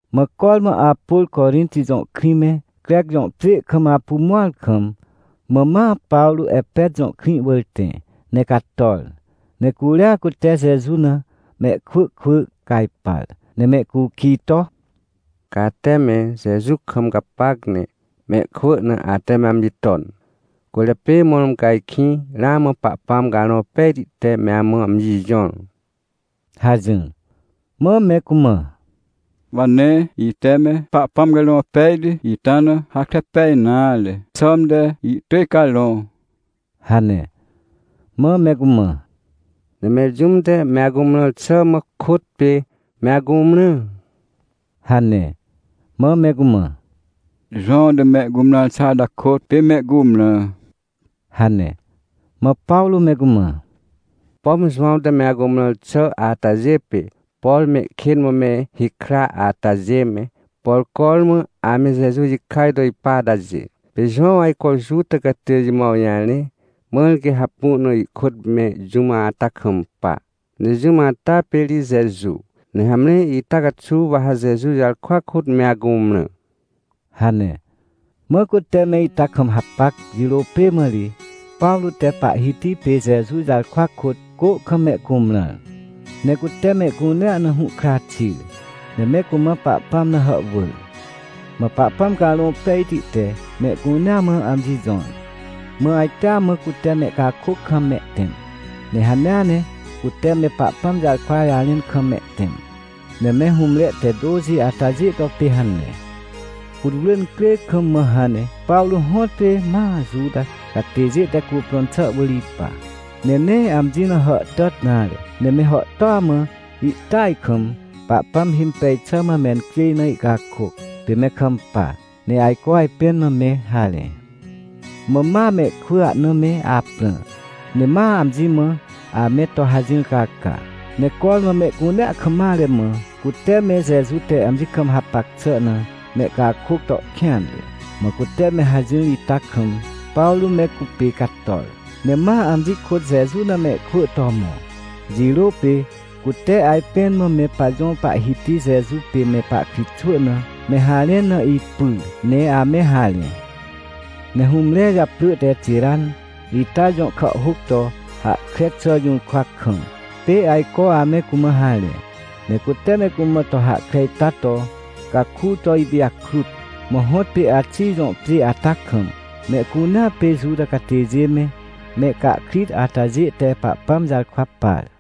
Mã cormã Apôr Corinti jõ krĩ me, Crec jõ pjê kam apu mõar kam, mã ma Pawrô Epet jõ krĩ wỳr tẽ, ne cator. Ne curia cute Jeju na mehkwỳ kwỳ cajpar, ne mehcukij to: — Ca ate me Jeju kam gapac ne mehkwỳ na ate me amji ton, cwỳrjapê mõrmõ ca ajkĩ ramã Pahpãm Carõ Pejti te me amã amji jõr? — hajỹr. Mã me cumã: — Wa nee ite me Pahpãm Carõ Pejti ita na hahkre pej nare, xãmte ihtỳj Carõ — hane. Mã me cumã: — Ne mẽr jũm te me acumrãr xà mã kôt pê me acumrã? — hane. Mã me cumã: — Jowãw te mehcumrãr xà ata kôt pê me icumrã — hane. Mã Pawrô me cumã: — Pom Jowãw te me acumrãr xà atajê pê, por mehkên mã me hikra atajê me, por cormã ame Jeju jikaj to ipa atajê. Pê Jowãw ajco Juta catêjê mã awjarẽ, mãr quê hapu na ihkôt me jũm ata kampa. Ne jũm ata pê ri Jeju, ne hamre ita caxuw wa ha Jeju jarkwa kôt me acumrã — hane. Mã cute me ita kam hapac jirô pê mã ri, Pawrô te Pahhiti pê Jeju jarkwa kôt, cô kam mehcumrãr. Ne cute mehcunea na hũhkra xir, ne me cumã Pahpãm na hàhwỳr. Mã Pahpãm Carõ Pejti te mehcunea mã amji jõr. Mã ajtea mã cute mehcakôc kam mehtẽm, ne hanea ne cute me Pahpãm jarkwa jarẽn kam mehtẽm. Ne me hũmre te tôxi atajê to pê hane. Putwrỳ incrê kam hãn ne Pawrô hõtpê ma Juta catêjê te cuprõn xà wỳr ipa, ne nee amji na hàhtàt nare, ne me hàhtôa mã ihtỳaj kam Pahpãm himpej xà mã mencjêj na ihcakôc, pê me kampa, ne ajco ajpẽn mã me harẽ. Mã ma mehkwỳ ahna me aprã, ne ma amji mã ame to hajỹr caca. Ne cormã mehcunea kam mare mã, cute me Jeju te amji kam hapac xà na mehcakôc to kêanre. Mã cute me hajỹr ita kam, Pawrô me cupê cator, ne ma amji kôt Jeju na mehkwỳ to mõ. Jirô pê cute ajpẽn mã me pajõ Pahhiti Jeju pê me pahkritxwỳ na me harẽn na ipyr ne ame harẽ. Ne hũmre japrỳ te Tiran ita jõ kàhhôc to hahkre xà jũrkwa kam, pê ajco ame cumã harẽ. Ne cute me cumã to hahkre ita to caku to ipijakrut. Mã hõtpê Axij jõ pjê ata kam mehcunea pê Juta catêjê me, mehcahkrit atajê te Pahpãm jarkwa par.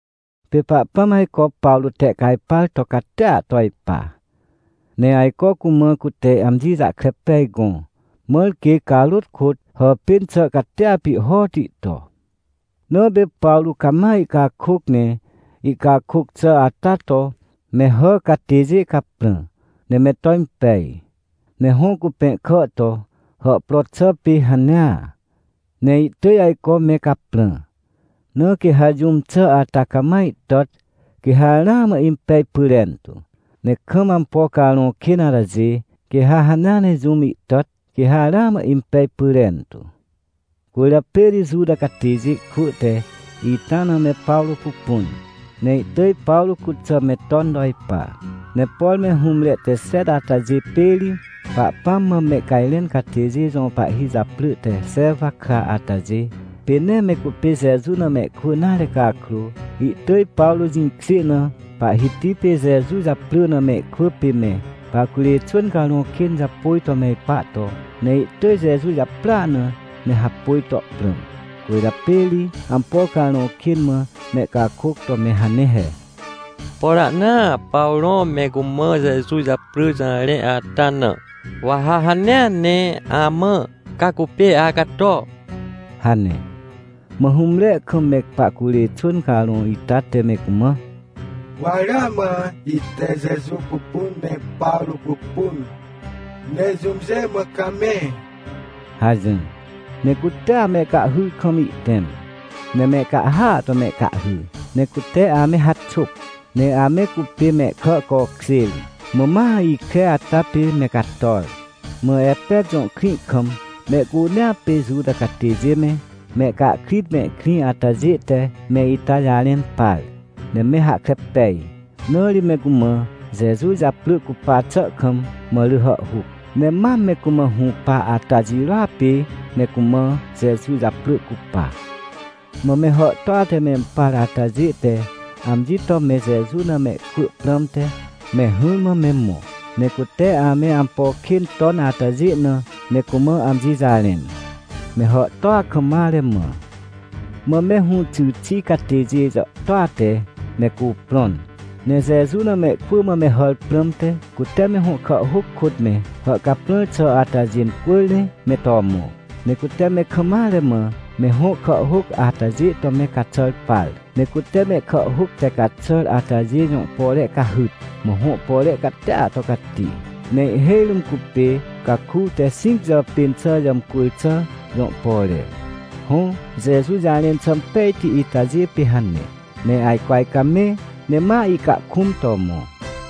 Pê Pahpãm ajco Pawrô tehcajpar to catia to ipa, ne ajco cumã cute amji jahkre pej gõ, mãr quê carôt kôt hàpên xà catia pihhoti to. Na pê Pawrô cama ihcakôc ne ihcakôc xà ata to me hà catêjê caprã, ne me to impej. Ne hõ cupẽhkà to, hàhpro xà pê hanea, ne ihtỳj ajco me caprã. Na quê ha jũm xà ata cama ihtàt, quê ha ramã impej pyrentu, ne kam ampo carõ kên atajê, quê ha hanea ne jũm ihtàt, quê ha ramã impej pyrentu. Cwỳrjapê ri Juta catêjê kwỳ te ita na me Pawrô pupun, ne ihtỳj Pawrô cuxà me ton to ipa. Ne por me hũmre te xet atajê pê ri Pahpãm mã mehcajrẽn catêjê jõ pahhi japrỳ te Xewa kra atajê, pê nee me cupê Jeju na mehkwỳ nare cakrô, ihtỳj Pawrô jĩkjê na Pahhiti pê Jeju japrỳ na mehkwỳ pê me pahcurê xwỳn carõ kên japôj to me ipa to. Ne ihtỳj Jeju japrỳa na me hapôj to prãm. Cwỳrjapê ri ampo carõ kên mã mehcakôc to me hane he: — Por ahnaa Pawrô me cumã Jeju japrỳ jarẽ ata na, wa ha hanea ne amã, ca cupê acato — hane. Mã hũmre kam me pahcurê xwỳn carõ ita te me cumã: — Wa ramã ite Jeju pupun, ne Pawrô pupun. Ne jũmjê mã ca me? — hajỹr. Ne cutea mehcahhyr kam ihtẽm. Ne mehcahhya to mehcahhy, ne cute ame haxôp, ne ame cupê mehkà cokjêr, mã ma ikre ata pê me cator. Mã Epet jõ krĩ kam mehcunea pê Juta catêjê me, mehcahkrit mehkrĩ atajê te me ita jarẽn par, ne me hahkre pej. Na ri me cumã Jeju japrỳ cupa xà kam mã rỳ hàhhuc. Ne mam me cumã hũpa ata jirôa pê me cumã Jeju japrỳ cupa. Mã me hàhtôa te mempar atajê te amji to me Jeju na mehkwỳ prãmte me hỹrmã me mõ, ne cute ame ampo kên ton atajê na me cumã amji jarẽn, me hàhtôa kam mare mã. Mã me hũxy xi catêjê jàhtôa te me cuprõn, ne Jeju na mehkwỳ mã me hàr prãmte, cute me hõ kàhhôc kôt me hàhcaprãr xà atajê incwỳr ne me to mõ. Ne cute me kam mare mã, me hõ kàhhôc atajê to me caxàr par. Ne cute mehkàhhôc te caxàr atajê jõ pore cahyt, mã hõ pore catia to cati, ne ihhêj rũm cupê caku te xĩc jàpên xà jàmcwỳr xà jõ pore. Hõ, Jeju jarẽn xà impejti itajê pê hane, ne ajco ajcamẽ ne ma ihcakũm to mõ.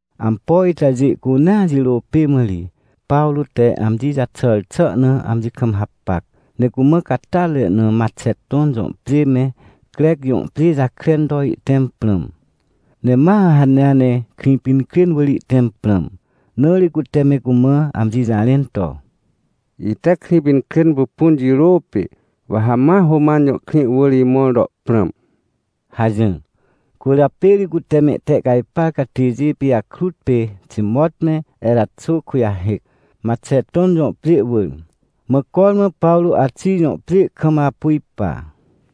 Ampo itajê cunea jirô pê mã ri Pawrô te amji jaxàr xà na amji kam hapac, ne cumã catyatre na Maxeton jõ pjê me Crec jõ pjê jakren to ihtẽm prãm. Ne ma hanea ne Krĩpinkrên wỳr ihtẽm prãm, na ri cute me cumã amji jarẽn to: — Ite Krĩpinkrên pupun jirô pê, wa ha ma Roman jõ krĩ wỳr imõr to prãm — hajỹr. Cwỳrjapê ri cute mehtehcajpar catêjê pijakrut pê Timot me Eraxô kujahêc, Maxeton jõ pjê wỳr. Mã cormã Pawrô Axij jõ pjê kam apu ipa.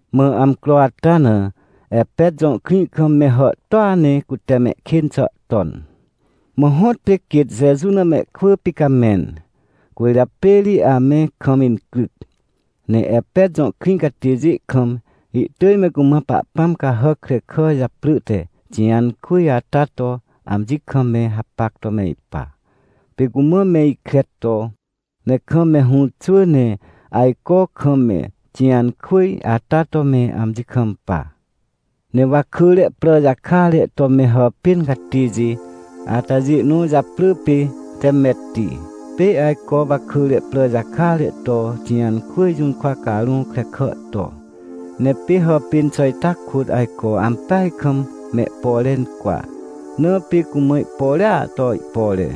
Mã amcro ata na Epet jõ krĩ kam me hàhtôa ne cute mehkên xà ton, mã hõtpê quêt Jeju na mehkwỳ picamẽn, cwỳrjapê ri ame kam incryc. Ne Epet jõ krĩ catêjê kam ihtỳj me cumã pahpãm cahàc krekà japrỳ te Tijãnkwỳj ata to amji kam me hapac to me ipa. Pê cumã me ikre to, ne kam me hũ xwỳ ne ajco kam me Tijãnkwỳj ata to me amji kampa. Ne wakỳre prà jakare to me hàpên catêjê atajê nõ japrỳ pê Temetti, pê ajco wakỳre prà jakare to Tijãnkwỳj jũrkwa carõ krekà to. Ne pê hàpên xà ita kôt ajco ampeaj kam mehpore incwa, na pê cumã ihporea to ihpore.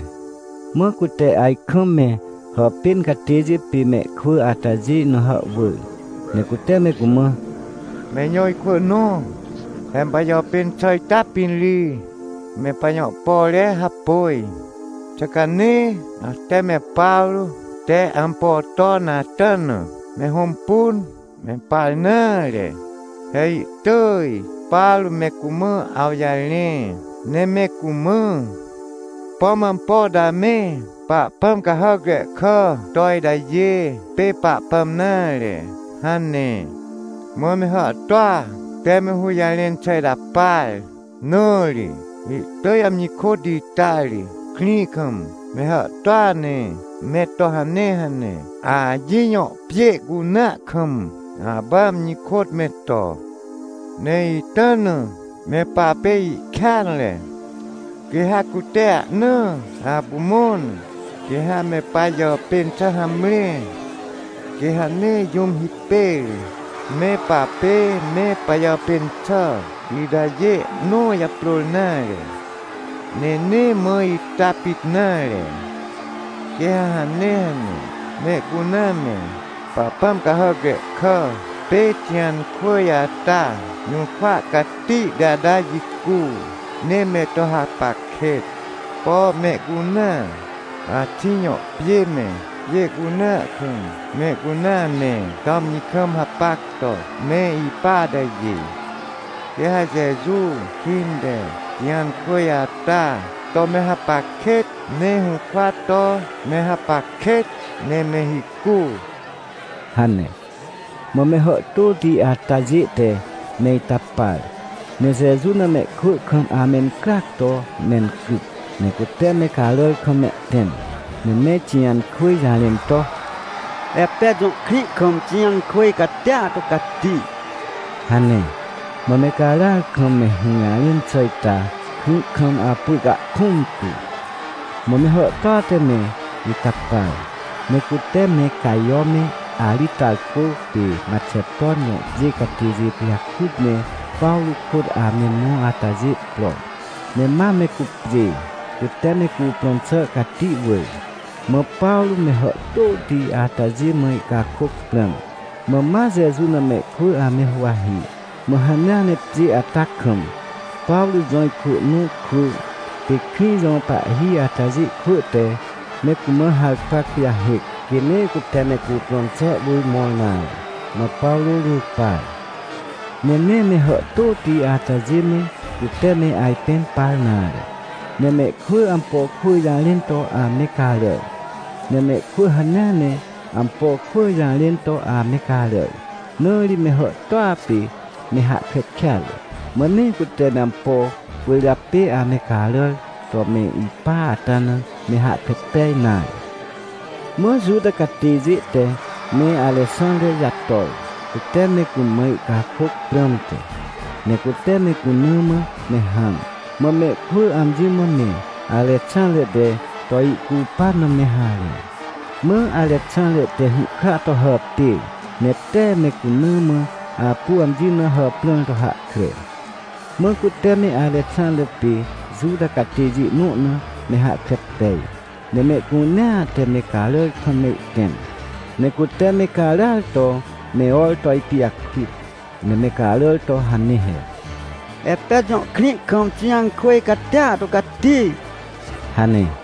Mã cute ajkam me hàpên catêjê pê mehkwỳ atajê na hàhwỳr, ne cute me cumã: — Me ijõ ikwỳ nõ, he me pajàpên xà ita pĩn ri me pajõ pore hapôj. Xà ca nee ate me Pawrô te ampo ton ata na me hõmpun ne mempar nare? He ihtỳj Pawrô me cumã awjarẽ, ne me cumã: “Pom ampo to ame pahpãm cahàc krekà to itajê pê Pahpãm nare” hane. Mã me hàhtôa te me hũjarẽn xà ita par, na ri ihtỳj amji kôt ita ri krĩ kam me hàhtôa ne me to hanea ne Axij jõ pjê cunea kam apu amji kôt me to. Ne ita na me papê ihkêanre. Quê ha cute ahnaa apu mõr na, quê ha me pajàpên xà hamre. Quê ha nee jũm hipêr me papê me pajàpên xà itajê nõ japrôr nare. Ne nee mã ita pit nare. Quê ha hanea ne mehcunea me pahpãm cahàc krekà pê Tijãnkwỳj ata jũrkwa catihti ata jicu, ne me to hapac kêt, por mehcunea Axij jõ pjê me, pjê cunea kam mehcunea ame to amji kam hapac to me ipa atajê. Quê ha Jeju kĩnteTijãnkwỳj ata to me hapac kêt, ne hũrkwa to me hapac kêt, ne me hicu — hane. Mã me hàhtôti atajê te me ita par, ne Jeju na mehkwỳ kam amencryac to mencryc. Ne cute me caràr kam mehtẽm, ne me Tijãnkwỳj jarẽn to: — Epet jõ krĩ kam Tijãnkwỳj catia to cati — hane. Mã me caràar kam me hũjarẽn xà ita krĩ kam apu ihcahkũm tu. Mã me hàhtôa te me ita par, ne cute me Cajo me Aritarcô pê Maxeton jõ pjê catêjê pijakrut ne Pawrô kôt ame mõ atajê pro, ne ma me cupjê, cute me cuprõn xà cati wỳr. Mã Pawrô me hàhtôti atajê mã ihcakôc prãm, mã ma Jeju na mehkwỳ ame huwahi. Mã hanea ne pjê ata kam Pawrô jõ ikwỳ nõ kwỳ pê krĩ jõ pahhi atajê kwỳ te me cumã harkwa kujahêc, quê nee cute me cuprõn xà wỳr mõr nare, mã Pawrô jũpar. Ne nee me hàhtôti atajê me cute me ajpẽn par nare. Ne mehkwỳ ampo kwỳ jarẽn to ame caràr, ne mehkwỳ hanea ne ampo kwỳ jarẽn to ame caràr. Na ri me hàhtôa pê me hahkre kêatre, mã nee cute ampo cwỳrjapê ame caràr to ame ipa ata na me hahkre pej nare. Mã Juta catêjê te me Arexãnre jator, cute me cumã ihcakôc prãmte. Ne cute me cuna mã me hãm. Mã mehkwỳ amji mã me Arexãnre te to ihcupan na me harẽ. Mã Arexãnre te hũhkra to hàpêr, ne tee me cuna mã apu amji na hàprãr to hahkre. Mã cute me Arexãnre pê Juta catêjê nõ na me hahkre pej, ne mehcunea te me caràr kam ihtẽm. Ne cute me caràar to me or to ipijakrut. Ne me caràr to hane he: — Epet jõ krĩ kam Tijãnkwỳj catia to cati! — hane.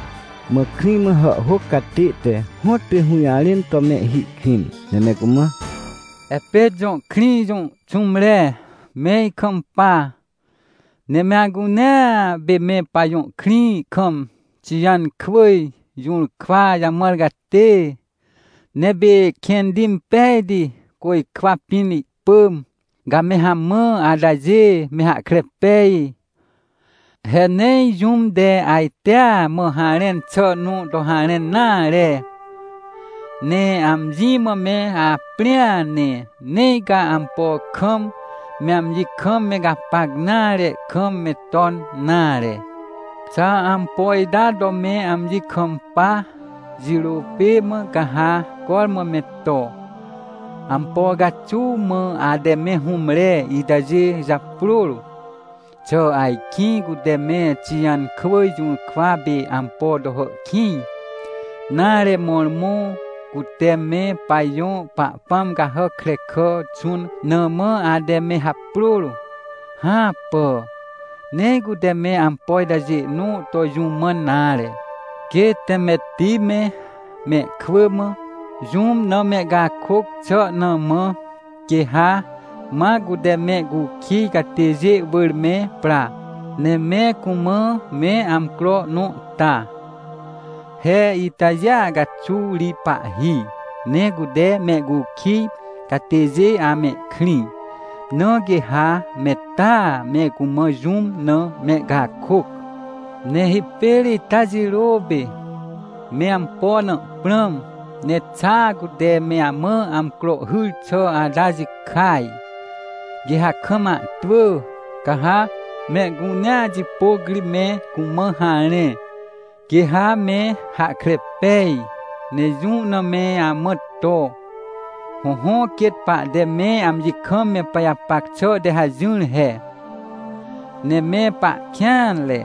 Mã krĩ mã hàhhôc catê te hõtpê hũjarẽn to mehhi kwĩn, ne me cumã: — Epet jõ krĩ jõ xũmre, me ikampa. Ne me acunea pê me pajõ krĩ kam Tijãnkwỳj jũrkwa jamãr catê, ne pê kẽnti impejti côjkwa pĩn ihpỳm, ca me hamã atajê me hahkre pej. He nee jũm te ajtea mã harẽn xà nõ to harẽn nare. Ne amji mã me aprĩa ne, nee ca ampo kam me amji kam me gapac nare kam me ton nare. Xa ampo ita to me amji kampa, jirô pê mã ca ha cormã me to. Ampo caxuw mã ate me hũmre itajê japrôr? Xà ajkĩ cute me Tijãnkwỳj jũrkwa pê ampo to hàhkĩj, nare, mõrmõ cute me pajõ pahpãm cahàc krekà xũn na mã ate me haprôr? Hãpà, nee cute me ampo itajê nõ to jũ mãn nare. Quê Temetti me, mehkwỳ mã, jũm na mehcakôc xà na mã, quê ha ma cute mehcukij catêjê wỳr me pra, ne me cumã me amcro nõ ta. He itajêa caxuw ri pahhi, ne cute mehcukij catêjê amehkrĩ. Na quê ha me taa me cumã jũm na mehcakôc. Ne hipêr ita jirô pê me ampo na prãm, ne xa cute me amã amcro hyr xà ata jikaj, quê ha kam ahtwỳ, ca ha mehcunea jipôc ri me cumã harẽ, quê ha me hahkre pej, ne jũ na me amã to. Hõhõ, quêt pahte me amji kam me pajapac xà te hajỹr he. Ne me pahkêanre.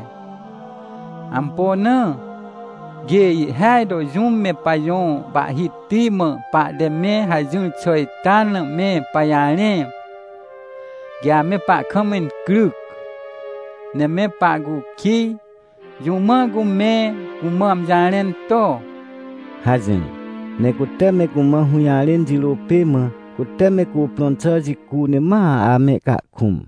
Ampo na? Quê ihhêaj to jũm me pajõ pahhiti mã pahte me hajỹr xà ita na me pajarẽ, quê ame pahkam incryc. Ne me pahcukij, jũ mã cu me cumã amji jarẽn to? — hajỹr. Ne cute me cumã hũjarẽn jirô pê mã cute me cuprõn xà jicu ne ma amehcahkũm.